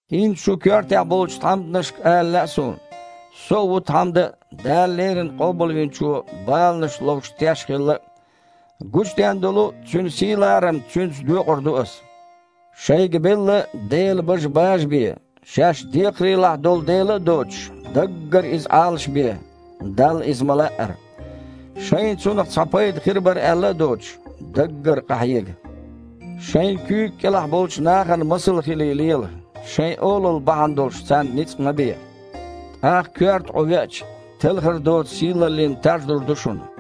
ХІинца шун коьртехь болчу тхьамданашка ала лаьа суна. Со а ву тхьамда а, Дала леррина Къобалвинчо баланаш ловш теш а хилла. Гучудаьн долу Цуьнан сий-ларам Цуьнца доькъур ду ас. Шайга белла Делан бажа бажабе. Шаьш декхарийлахь долу дела а доцуш, даггара иза Іалашбе, Далла иза ма-лаъара. Шайна цунах цхьа пайда хир бара аьлла а доцуш, даггара къахьега. Шайн куьйга кІелахь болчу нахана масал хилий лела, шайн олалла бахьана долуш царна ницкъ ма бе. ТІаккха, коьрта Іу веача, телхар доцу сийлаллин таж лур ду шуна.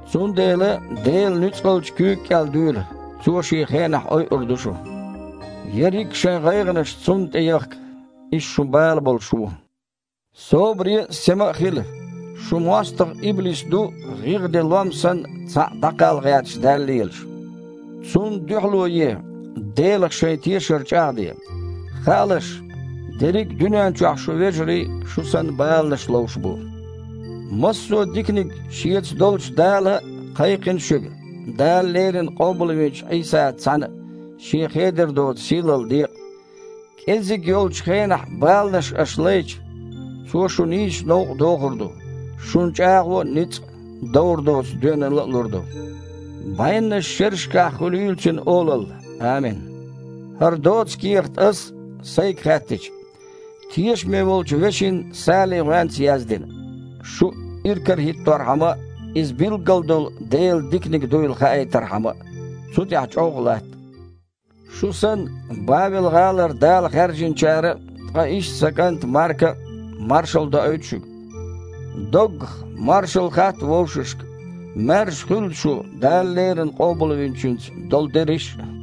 Цундела Делан нуьцкъалчу куьйга кІел дуьйла, Цо Шен хенахь ойур ду шу. Берриг а шайн гІайгІанаш Цунна тІе яхка, Иза шун бала болуш ву! Собаре а, сема а хила! Шун мостагІа, иблис, ду, гІигІ ден лом санна, цхьаъ дІакхалла гІерташ даьлла лелаш. Цунна дуьхьало е, Делах шайн тешар чІагІде. Хаалаш, дерриг а дуьнен чохь шун вежарий, шу санна, баланаш ловш бу. Массо а диканиг Шеца долчу Дала кхайкхина шуьга Дала леррина къобалвинчу Іийсаца цхьаьна Шен хедар доцу сийлалла декъа. КІеззиг йолчу хенахь баланаш аш лайча, Цо шу нийсачу новкъа дохур ду, шуна чІагІо а, ницкъ а, довр доцу доьналла а лур ду. БІеннаш шерашкахь хуьлийла Цуьнан олалла, амин. ХІара доца кехат ас (сайга хаьттича) тешаме волчу вешин Салин гІоьнца яздина, шу иракарахІитторхьама а, иза билггала долу Делан диканиг дуйла хаийтархьама а. Цу тІехь чІоггІа латта! Шу санна, Бавел-гІалара Дала хаьржиначара а, ткъа иштта сан кІанта Марка а маршалла доуьйту шуьга. Доггах, маршалла хатта вовшашка. Маьрша хуьлда шу Дала леррина Къобалвинчуьнца долу дерриш а.